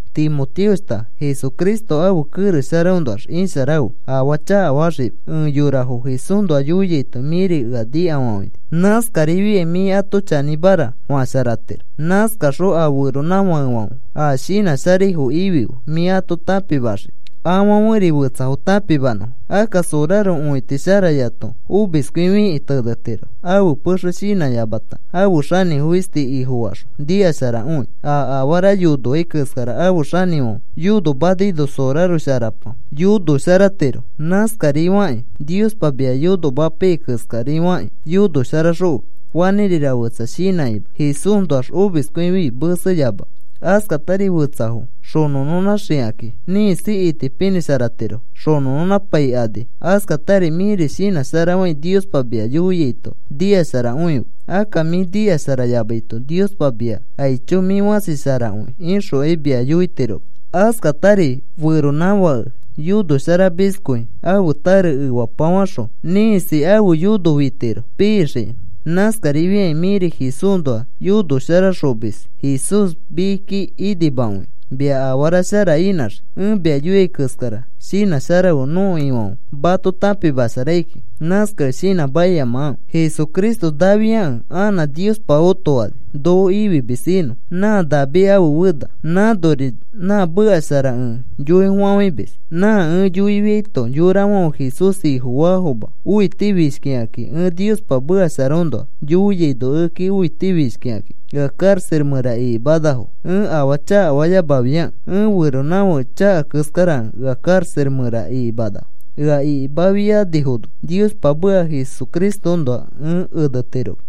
Timoteoshta, Jesucristo ãfe kerex sharaõnoax isharafe, afaa chakafaxima. Ẽ yorafo Jesúsnoa yoiaito mĩri ea nikafafãini. Nãskarifiai mĩ ato chanĩmara fasharatiro. Nãskaxõ a feronãfakefãfe a shinã sharaifo ifife mĩ ato tãpimaxikĩ afãferi fetsafo tãpimanõfo. Akka soraro õiti sharayato omiskõifikĩ tenetiro. Ãfe pexe shinãyamata ãfe xanĩfo fisti ifofaxõ nikasharakõi. A afara yonoai keskara ãfe xanĩfãfe yonomanaino soraro sharapa yonosharatiro. Nãskarifakĩ Niospa mia yonomapaiyai keskari fakĩ yonosharaxõfe fanĩrira fetsa shinãkima. Jesúsnoax omiskõifi meseyamafe. Askatari fetsafo xonõnõnãxikakĩ ĩkisi itipinĩsharatirofo xonõnõnãpaikani. Askatari mĩri shinãsharafai Niospa mia yoiaito nikasharakõife. Akka mĩ nikasharayamaito Niospa mia, “Aicho, mĩ fãsi sharakõi,” ixokai mia yoitiroma. Askatari feronãfãke yonosharamiskõi ãfe tare efapafaxõ, ĩkisi ãfe yono fitiro pixikĩ. Nãskarifiakĩ mĩri Jesúsnoa yonoxosharamis Jesús mikiki inimakõinõ mia afara shara inãxii. Ẽ mia yoiai keskara shinãsharafe. Nõko Ifãfe mato tãpimasharai kiki. Nãskakẽ shinãmakiyamafe Jesucristo naafiakẽ anã Niospa otofani noko ifimis inõ. Nã David ãfe fena. Nãnori nã meka shara ẽ yoifafãimis. Nã ẽ yoifiaito, yorafãfe Jesús Ifofaafoma õitifishkikakĩ. Ẽ Niospa mekasharaõnoa yoiaino ekeki õitifishkikakĩ ea karaxa mẽra ikimanafo. Ẽ afaa chakafayamafiakẽ ẽ feronãfake chaka keskarakẽ ea karaxa mẽra ikimanafo. Ea ikimafianifono Niospa meka Jesucristoõnoa ẽ enetiroma.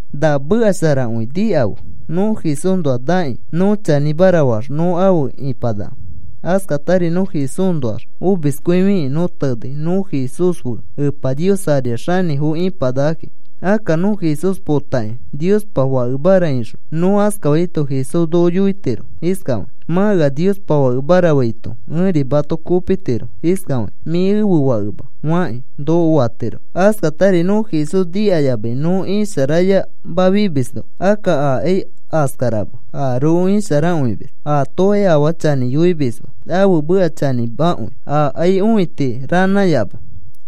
Na meka sharakõi nikafe: Nõ Jesúsnoax nakĩ nõ chanĩmara faax nõ afe ĩpanaka. Askatari nõ Jesúsnoax omiskõifikĩ nõ tenei, nõ Jesús fe Epa Nios ariax xanĩfo ĩpanakakĩ. Akka nõ Jesús potakĩ, “Niospa fakemara,” ixõ nõ askafaito Jesús noko yoitiro iskafakĩ: “Mã ea Niospa Fakemara faito ẽri mato kopitiro iskafakĩ: Mĩ ẽfe fakema,” fakĩ noko fatiro. Askatari nõ Jesús nikayamai nõ isharayamafimisno, akka akai askarama, aroko isharakõimis. Aatokai afaa chanĩ yoimisma, ãfe meka chanĩmakõi. Aakai õiti ranãyama.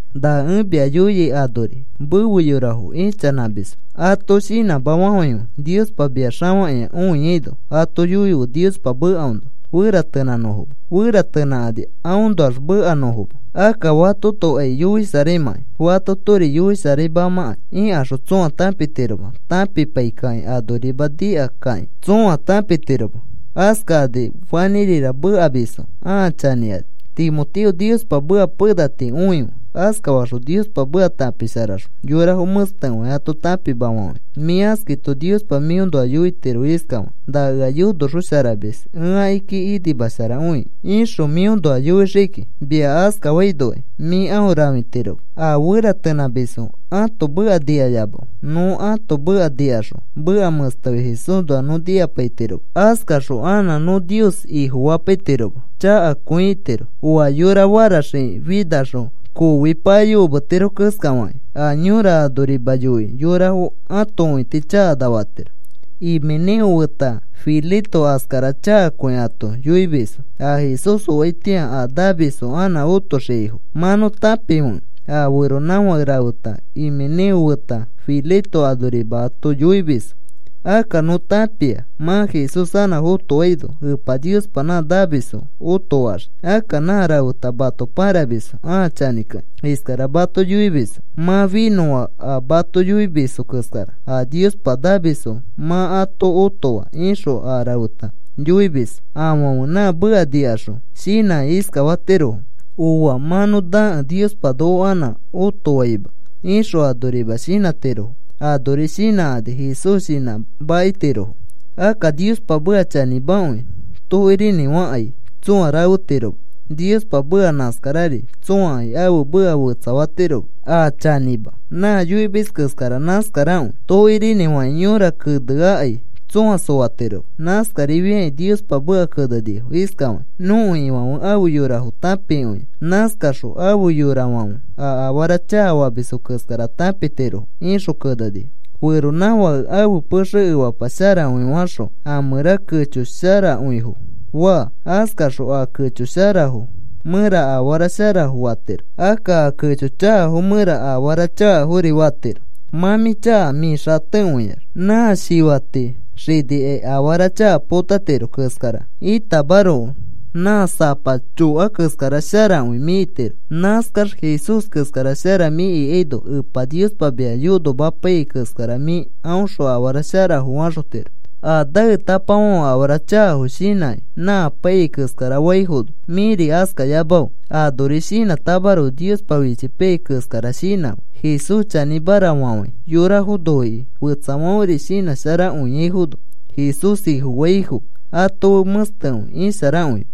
Na ẽ mia yoiai anori, mefe yorafo ichanãmisfo ato shinãma fafãife. Niospa mia xafakĩa õiaino ato yoife Niospa mekaõnoa feratenãnõfoma, feratenãkani aõnoax mekanõfoma. Akka fatotokai yoisharaimãkai fatotori yoisharaimamãkai ikaxõ tsõa tãpitiroma tãpipai kakĩ. Anorima nika kakĩ tsõa tãpitiroma. Askakani fanĩrira mekamisfo ãa chanĩkani. Timoteo, Niospa meka pena tii õife. Askafaxõ Niospa meka tãpisharaxõ yorafo mẽstekõi ato tãpimafafãife. Mĩ askaito Niospa mĩõnoa yoitiro iskafakĩ: “Na ea yonoxosharamis, ẽ akiki inimasharakõi,” ixõ mĩõnoa yoixiki. Mia askafainokai mĩ aõ rãfitiroma. A feratenãmisfo ãto meka nikayamafe. Nõ ãto meka nikaxõ meka mẽstekõi Jesúsnoa nõ nikapaitiroma. Askaxõ anã nõ Nios Ifofapaitiroma. Chakakõi itiro. Oa yora faraxiki finaxõ, koofi payokometiro keskafakĩ, a yõra anorima yoikĩ yorafo ãto õiti chakana fatiro. Himeneo feta Fileto askara chakakõi ato yoimisfo. A Jesús oaitĩa a namisfo anã otoxiaifo mã nõ tãpifekẽ, a feronãfake rafeta Himeneo feta Fileto anorima mato yoimisfo. Akka nõ tãpia mã Jesús anã fotoaino Epa Niospa nã namisfo otofaxii. Akka nã rafeta mato pãramisfo ãa chanĩkakĩ. Iskara mato yoimisfo: “Mã finõa a mato yoimisfo keskara. A Niospa namisfo mã ato otofaa,” ixõ a refeta yoimis. Afãfe nã meka nikaxõ shinãkĩ iskafatirofo: “Ooa. Mã nõ nakẽ Niospa noko anã otofaima,” ixõ anorima shinãtirofo. Anori shinãkani Jesús shinãmakitirofo. Akka Niospa meka chanĩmakõi. Tokirinĩfakai tsõa rafetiroma. Niospa meka nãskarari. Tsõakai ãfe meka fetsafatiroma. A chanĩma, nã yoimis keskara nãskarakõi. Tokirinĩfakĩ yõra keneakai tsõa soatiroma. Nãskarifiakĩ Niospa meka kenenifo iskafakĩ: “Nõko Ifãfe afe yorafo tãpikõia.” Nãskakaxõ, “Afe yorafãfe a afara chakafamisfo keskara potatirofo,” ixõ kenenifo. Feronãfãke ãfe pexe efapa sharakõi faxõ a mẽra kecho sharakõifo faa, askaxõ a kecho sharafo mẽra afara sharafo fatiro. Akka a kecho chakafo mẽra afara chakafori fatiro. Mã mĩ chaka mĩ xatekõiax, nã fẽta xinikĩ afara chaka potatiro keskara itamaroko. Nã sapa choka keskara sharakõi mĩ itiro. Nãskax Jesús keskara shara mĩ ikaino Epa Niospa mia yonomapaiyai keskara mĩ aõxõ afara sharafo faxotiro. A naetapafãfe afara chakafo shinãkĩ nã apaiyai keskara faifono mĩri askayamafe. Anori shinãtamaroko Niospa fichipaiyai keskara shinãfe, Jesús chanĩmara fafãi, yorafo noikĩ, fetsafãferi shinãsharakõiaifono, Jesús Ifofaifo ato fe mẽstekõi isharakõife.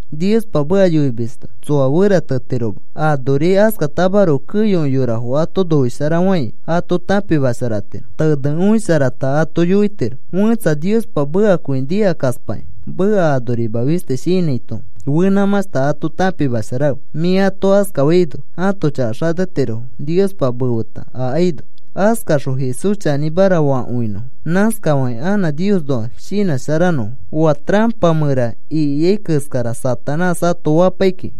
Niospa meka yoimisto tsoa feratetiroma. Anori askatamaroko keyokõi yorafo ato noisharafãi, ato tãpimasharatiro, tenekõisharata ato yoitiro. Fẽtsa Niospa mekakõi nikakaspakĩ meka anorima fisti shinãito, fenãmãshta ato tãpimasharafe. Mĩ ato askafaino ãto chaka xatetirofo Niospa mefeta akaino. Askaxõ Jesús chanĩmara fakõinõfo. Nãskafakĩ anã Niosnoa shinãsharanõfo. Oa tarapa mẽra ikia keskara Satanás ato fapai kiki.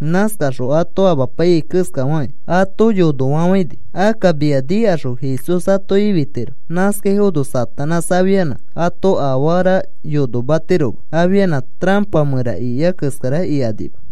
Nãskaxõ ato amapaiyai keskafakĩ ato yonofafãini. Akka mia nikaxõ Jesús ato ifitiro. Nãskaifono Satanás afianã ato afara yonomatiroma. Afianã tarapa mẽra ikia keskara ikanima.